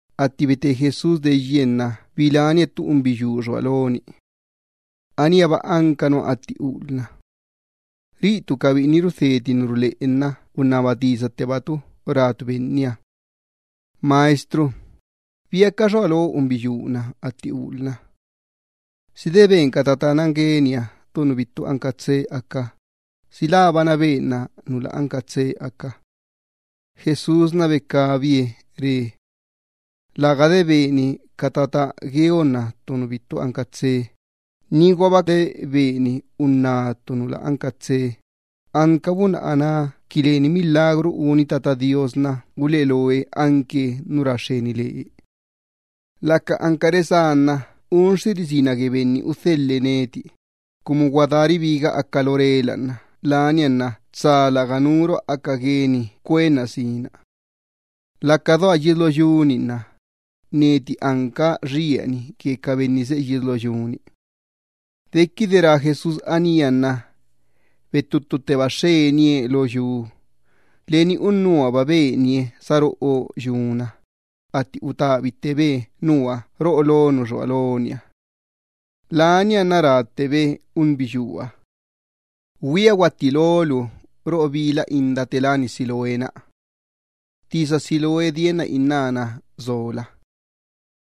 Atti bete Jesús deyye nna bilánie ttu unbiyuu xua loni. Aníaba anca nua atti ulna. Ca biꞌini rudheti ca tisa ruleꞌe nna unnaba tisa cabi rácabi Benniha: —Maestro, ¿biaca xua lo unbiyuu-na atti ulna? ¿Si de ben ca tata gueniha ttu nu bittu anca tsee aca, si labana benna nu lä anca tsee aca? Jesús becabie re: —Läga de beni ca tata nan gueonna ttu nu bittu anca tsee, niguaba de beni unná ttu nu lä anca tsee, anca bunna aná qui leni milagru uni Tata Do Iyyabaaha nna uleꞌe loe anque nu ra xxeni lee. Laca anca resá nna unxxiri sina gue Benni udhelhe neti, cumu gua daa ribiga aca lo rela nna lania nna tsa lärga nuruha aca gueni cuenna sina. Laca doa yies lo yu-ni nna neti anca xieni gue ca benni seꞌe yies lo yu-ni. Dequide rá Jesús anía nna bettuttutteba xxenie lo yu. Leni unnuhaba benie saroꞌo yuna, atti utabittebe nua roꞌo lo nu xua loniha. Nianna ráttebe unbiyuuha: —Güia guattí lolu roꞌo bila inda te láni Siloé-na. (Tisa Siloé dienna innána sola.)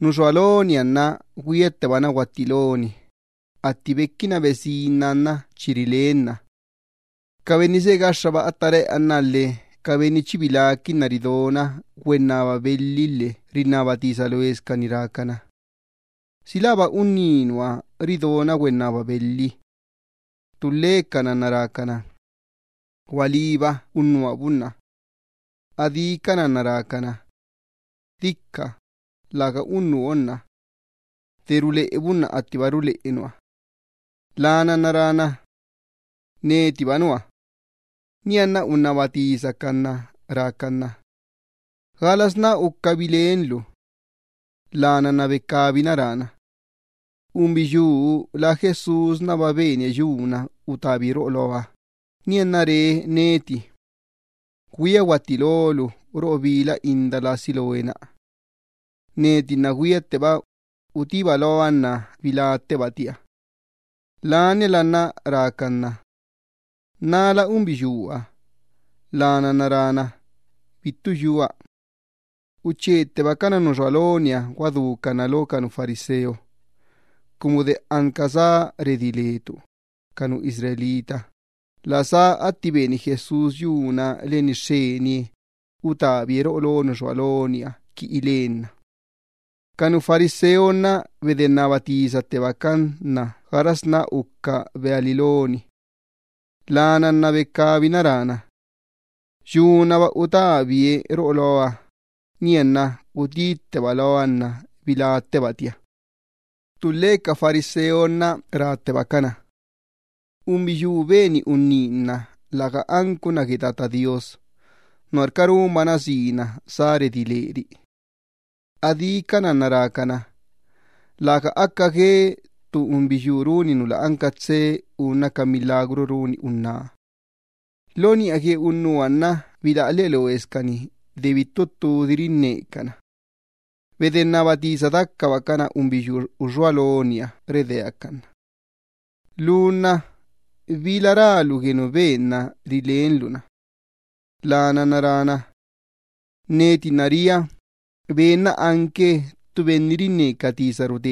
Nu xua loniha nna güiattebana guattí loni, atti bequina besinna nna chi rilenna. Ca benni seꞌe gaxxaba atta reꞌanna lhe ca benni chi biláquinna ridona güennaba belhi lhe rinnaba tisa loescani rácana: —¿Si läba unníba nua ridona güennaba belhi? Ttulhecana nna rácana: —Gualíba, unnuha bunna. Adícana nna rácana: —Dica, läga unnuha unná. De ruleꞌe bunna attiba ruleꞌe unnuha. Lana nna rána: —Netiba nua. Nianna unnaba tisacan na rácan na: —¿Galasná uca bilenlu? Lana nna becabina rána: —Unbiyuu lá Jesúsba benie yuna utabie roꞌo loa, nianna re neti: “Güia guattí lolu roꞌo bila inda lá Siloé-na.” Neti nna güiatteba, utíba loa nna biláttebatia. Laniala nna rácan na: —¿Nala unbiyuuha? Lana nna rána: —Bittu yua. Uchettebacana nu uxua loniha guadúcan na lo ca nu fariseo, cumu de anca sá redí le ca nu Israel, la sá atti beni Jesús yuna leni xxenie, utabie roꞌo lo nu uxua loniha qui ilenna. Ca nu fariseo nna bedennaba tisattebacan na gaxasná uca beali loni. Lana nna becabina rána: —Yunaba utabie roꞌo loa, nianna utítteba loa nna biláttebatia. Ttulhe ca fariseo nna ráttebacana: —Unbiyuu beni unní nna läga anca unná gue Tata Do Iyyabaaha, nuarca runbana sina sá redí leri. Adícana nna rácana: —Läga aca gue ttu unbiyuu runi nu lä anca tsee unna ca milagru runi unná. Lo niꞌa gue unnuha nna bilaꞌa lheꞌe loescani de bittu ttudi rinnecana. Bedennaba tisa dacabacana unbiyuu uxua loniha redeácan na: —Lu nna ¿bila rálu gue nu benna rilenlu-na? Lana nna rána: —Neti nna ria, Ben-na anque ttu profeta.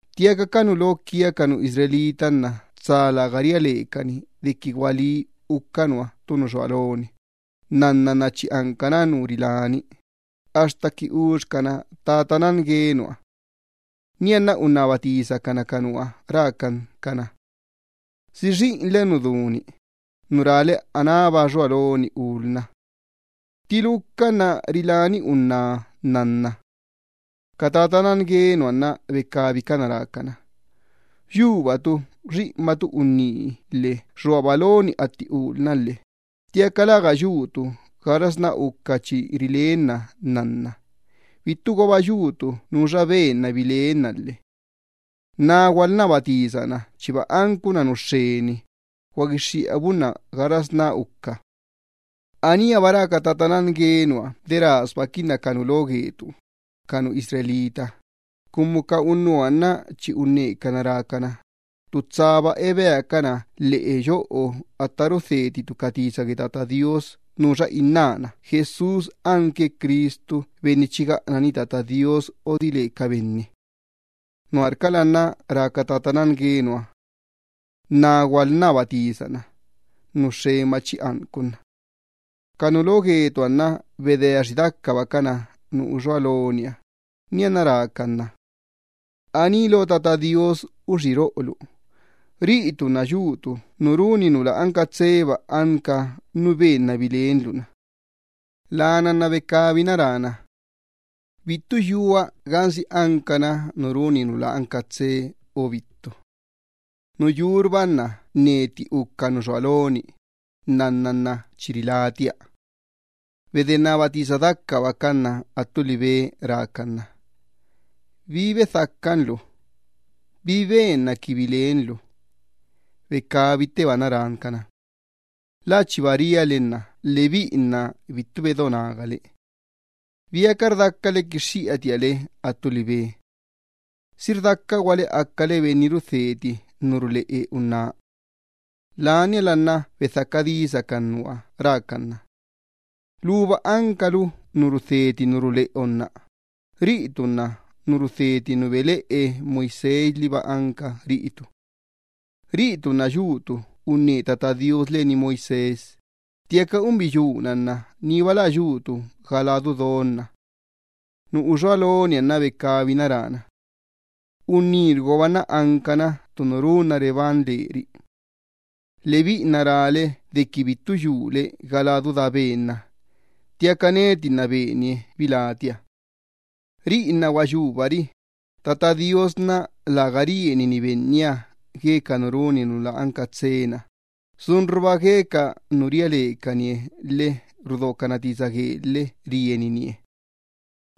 Ttiaca ca nu lo gue ca benni Israel nna tsa läga ria lecani dequi gualí uca nua ttu nu xua loni, nnanna nna chi ancana nu riláni, axta qui uxcana tata nan gue nua. Nianna, unnaba tisacana ca unnuha rácan cana: —¿Si xiꞌinle nu du-ni, nu rále anába xua loni ulna? ¿Ttiluca nna riláni unná nnanna? Ca tata nan gue nua nna becabicana rácana: —Yubatu xiꞌinbatu unní lhe xuaba loni atti ulna lhe ttiaca läga yutu gaxasná uca chi rilenna nnanna, bittuguaba yutu nuxa benna bilenna lhe. Na gualnnaba tisa na chiba anca unná nu xxeni, guaguixxiꞌa bunna gaxasná uca bilenna. Aníaba rá ca tata nan gue nua de rasbaquinna ca nu lo gue ca benni Israel, cumu ca unnuha nna chi unnecana rácana, ttu tsaba ebeacana lheꞌe yoꞌo atta rudheticana ca tisa gue Tata Do Iyyabaaha nuxa innána Jesús anque Cristu Benni chi gaꞌanani Tata Do Iyyabaaha odile ca benni. Nuarcala nna rá ca tata nan gue nua: “Na gualnnaba tisa-na, nu xxenba chi anca unna.” Ca nu lo gue ca benni Israel nna bedeaxi dacabacana nu uxua loniha, nianna rácan na: —Aní lo Tata Do Iyyabaaha uxí roꞌolu. Riꞌitu nna yutu nu runi nu lä anca tseeba anca nu benna bilenlu-na. Lana nna becabina rána: —Bittu yua gansi ancana nu runi nu lä anca tsee o bittu. Nu yurba nna neti uca nu xua loni, nnanna nna chi rilátia. Bedennaba tisa dacabacan na attu libe rácan na: —¿Bi bedhacan lu? ¿Bi benna qui bilenlu? Becabittebana rán cana: —Lä chiba ria le nna lebiꞌi nna bittu bedo nagale. ¿Biaca rdacale quixxiꞌatia le attu libe? ¿Si rdacaguale acale benni rudheti ca tisa ruleꞌe Ben-na? Laniala nna bedhaca disacan nua rácan na: —Luba ancalu nu rudheti ca tisa ruleꞌe unná, riꞌitu nna nu rudheti nu beleꞌe Moisés liba anca riꞌitu. Riꞌitu nna yutu unne Tata Do Iyyabaaha len Moisés, ttiaca unbiyuu-na nna niba lä yutu ga ladu don-na. Nu uxua loniha nna becabina rána: —Unnírguaba nna ancana ttu nu runna reban leri. Lebiꞌi nna rále dequi bittu yule ga ladu daa Ben-na, ttiaca neti nna benie bilátia. Riꞌi nna gua yubari, Tata Do Iyyabaaha nna läga rienini benniha gue ca nu runi nu lä anca tsee-na, sunruba gue ca nu ria lecanie lhe rudocana tisa guee lhe rieninie.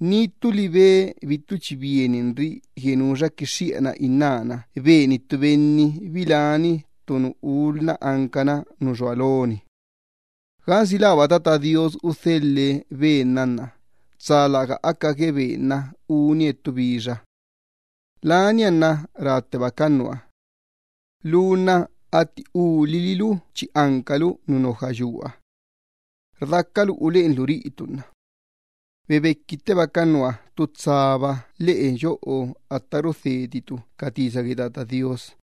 Ni ttu libe bittu chi bieninri gue nuxa quixxiꞌana innána beni ttu benni biláni ttu nu ulina ancana nu xua loni, gansi läba Tata Do Iyyabaaha udhelhe Ben-na nna, tsa läga aca gue Ben-na unie ttu bixa. Lania nna ráttebacana nua: —Lu nna atti ulililu chi ancalu nu te tulha gueni. ¿Rdacalu uleꞌenlu riꞌitu nna? Bebequittebacan na ttu tsaba lheꞌe yoꞌo atta rudheticana ca tisa gue Tata Do Iyyabaaha.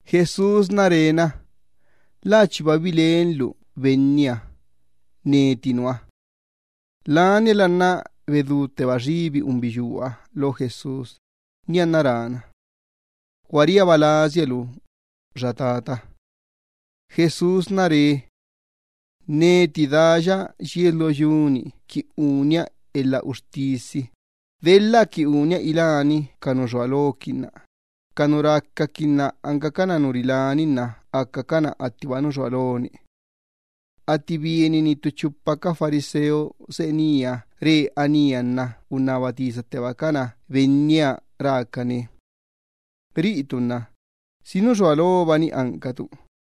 Jesús re na: —La chiba bilenlu Benniha. Neti nua. Laniala nna bedútteba xibi unbiyuuha lo Jesús, nianna rána: —Gua riaba lasia lu, xa tata. Jesús re: —Neti daya yies lo yu-ni qui unia elha uxtisi, delha qui unia iláni ca nu xua loquinna ca nu racaquinna ancacana nu riláni nna acacana attiba nu xua loni. Atti bienini ttu chupa ca fariseo seꞌe nía re anía nna unnaba tisattebacana Benniha rácane: —Riꞌitu nna, ¿si nu xua lobani ancatu?